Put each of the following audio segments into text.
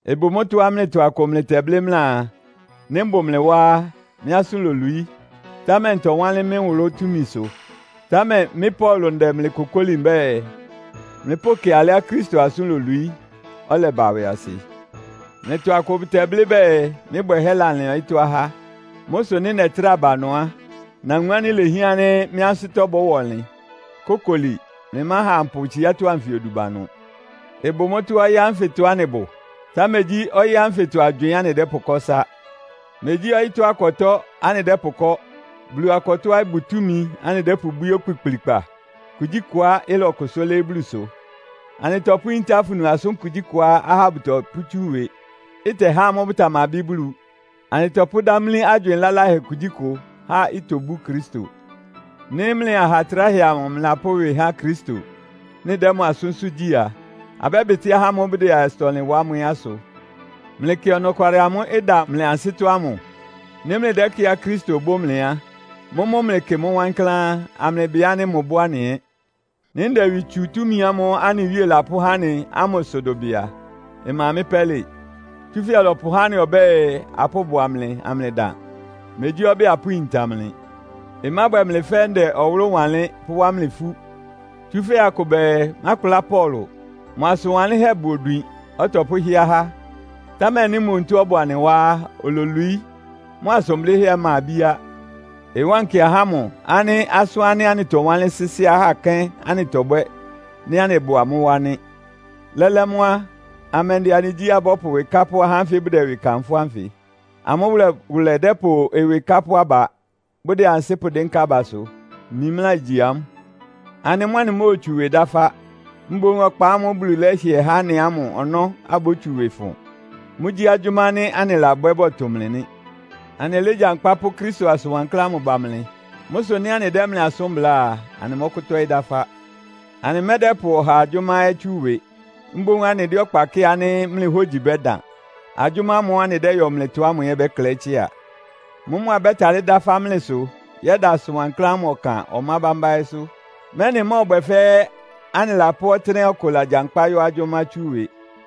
Ɩbʋ mʋ́tɔ́á mlɩtɔ akʋ mlɩtɛblɩ́ mlɩaa, nɩ́ mbʋ mlɩ wá á, mɩ́ asʋ́n lolwií, támɛ ntɔwánlɩ́n mɩ́ nwʋlʋ́ túmisʋ. Támɛ mɩ́ Paulo ndɛ mlɩ kokóli mbɛ́ɛ, mlɩpʋ́kɩ alɩá Kristo asʋ́n lolwií, ɔlɛba ɩwɩasɩ. Mlɩtɔ akʋ bʋdɛblɩ́ bɛɛ, mɩ́ bwɛhɛ́ lalɩan ɔyɩ́tɔ́ ahá. Mʋ́ sʋ nɩ́ nɛtrá ba ɩnʋ á, nawun ánɩ́ ilehián ánɩ́ mɩ́ ansɩ́tɔ́ bɔ́wa ɔnlɩn. Kókoli, mlɩmáha ampʋ tsiátɔ́ anfɩ odu ba ɩnʋ. Ɩbʋ mʋ́tɔ́á ɔyɩ́ ánfɩtɔ anɩbʋ, támɛ megyí ɔyɩ́ anfɩtɔ agywɩɩn anɩdɛ́pʋkɔ́ ɩsá. Megyí ɔyɩ́tɔ́ akɔtɔ́ anɩdɛ́pʋkɔ́. Bulu akɔtɔ́á ɩbʋ túmi anɩdɛ́pʋbwíé okpikplikpa kugyíkʋá ɩtɔkʋ́sʋ́ lɩ́ɩ́ Bulusʋ. Anɩtɔpʋ́yíntá afunu asʋ́n kugyíkʋá ahá bʋtɔpʋ́tsú ɩwɩ, ɩtɛhá amʋ́ bʋtamabɩ́ Bulu. Anɩtɔpʋ́dámlí agywɩɩn laláhɛ kugyíkʋ, há itobú Kristo. Nɩ́ mlɩ aha tráhɛ amʋ mlɩlapʋ́ ɩwɩ há Kristo, mlɩdɛ́ mʋ asʋ́nsʋ́ gyí a, abɛ́bɩtɩ́ ahá ámʋ́ʋ́ bʋdɛ asʋtɔ-ɔnlɩn wa ámʋ ɛ́ asʋ. Mlɩkɩ ɔnɔkwalɩ amʋ́ʋ́ ɩda mlɩ ansɩ́tɔ́ ámʋ. Nɩ́ mlɩdɛ́kɩ́ɩá Kristo bʋ́ mlɩ á, mʋ́mʋ́ mlɩkɩ mʋ́ wankláán, amlɩbɩ ánɩ́ mʋbʋ́ anɩ ɛ́. Nɩ́ ndɛ ɩwɩ tsu túmi ámʋ́ʋ́ anɩ Wíe lapʋ́há anɩ ámʋ sʋ dʋbɩ a, ɩma mɩ́ pɛ́lɩ. Tsúfɛ́ ɔlɔpʋhá anɩ ɔbɛ́ɛ, apʋ́bʋa mlɩ amlɩdan. Megyí ɔbɛ́ɛ, apʋ́yinta mlɩ. Ɩmábwɛ mlɩ fɛ́ ndɛ nwʋlʋ́ wanlɩ́n, pʋ́wá mlɩ ifú. Tsúfɛ́ akʋ bɛɛ, “Mákpla Paulo. Mʋ asʋn wanlɩ́nhɛ́ bʋ odwin, ɔtɔpʋ́hɩ́ɛ́ ahá. Támɛ nɩ́ mʋ onutó ɔbʋ anɩ wá á, ololwií, mʋ asʋn blɩ́hɛ́ ɛ́ ɩma ibíá!” Ɩwánkɩ ahá ámʋ ánɩ́ asʋ́n ánɩ́ anɩtɔwánlɩ́n sɩ́sɩ́ ahá kɛ́n anɩtɔbwɛ́ nɩ́ anɩbʋ amʋ́ wá nɩ́. Lɛ́lɛ́ mʋ́ á, amɛndɩ anɩgyíá abɔ́pʋ ɩwɩ kápʋ́ ahá ánfɩ bʋdɛ ɩwɩ kanfʋ́ ánfɩ? Amʋ́ wʋlɛwʋlɛ dɛ́pʋ ɩwɩ kápʋ́ aba, bʋdɛ ansɩ́ pʋdɩ́nká abasʋ. Mimlá igyi amʋ́. Anɩ mʋ́ anɩmóotsu ɩwɩ dáfá, mboún ɔkpa ámʋ́ʋ́ Bulu lɛ́hɩɛ há anɩ ámʋ ɔnɔ́ abótsu ɩwɩ fʋn. Mʋ́gyí agyʋ́má ánɩ́ anɩlabwɛ́ bɔtʋ mlɩ nɩ́. Anɩlégyankpá pʋ́ Kristo asʋn wankláán ámʋ ba mlɩ. Mʋ́ sʋ nɩ́ anɩdɛ́ mlɩ asʋ́n bláa a, anɩmɔ́kʋ́tɔ́ɩ́ dáfá. Anɩmɛ́dɛ́pʋ ɔhaa agyʋ́má ɛ́ tsú ɩwɩ. Mboún anɩdɛ́ ɔkpa kɩ́ɩ ánɩ́ mlɩ hógyi bɛ́dan. Agyʋ́má ámʋ́ʋ́ anɩdɛ́yɔ mlɩtɔ ámʋ ɛ́ ɩbɛ́klɛɩ́ tsɩ́a. Mʋ́mʋ́ abɛ́talɩ́ dáfá mlɩsʋ yɛ́da asʋn wankláán ámʋ ɔkan ɔmá bámbá ɛ́sʋ́, mɛ́nɩ ɩmɔ́ɔbwɛ fɛ́ anɩlapʋ́ ɔtɩ́nɛ́á ɔkʋ lagyankpá yɔ́ agyʋ́má tsú ɩwɩ.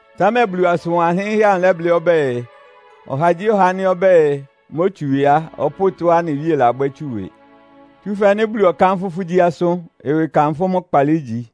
Támɛ Bulu asʋn wanlɩ́nhɛ́ amʋ lɛ́blɩ́ ɔbɛ́ɛ, “Ɔhagyíɔha ánɩ́ ɔbɛ́ɛ, mótsu ɩwɩ á, ɔpʋ́ʋ tɔ́á anɩ Wíe labwɛ́ tsu ɩwɩ.” Tsúfɛ́ nɩ́ Bulu ɔkánfʋ́ fʋ́ gyí asʋ́n, ɩwɩ kanfʋ́ mʋ́ kpaalɩ ígyi.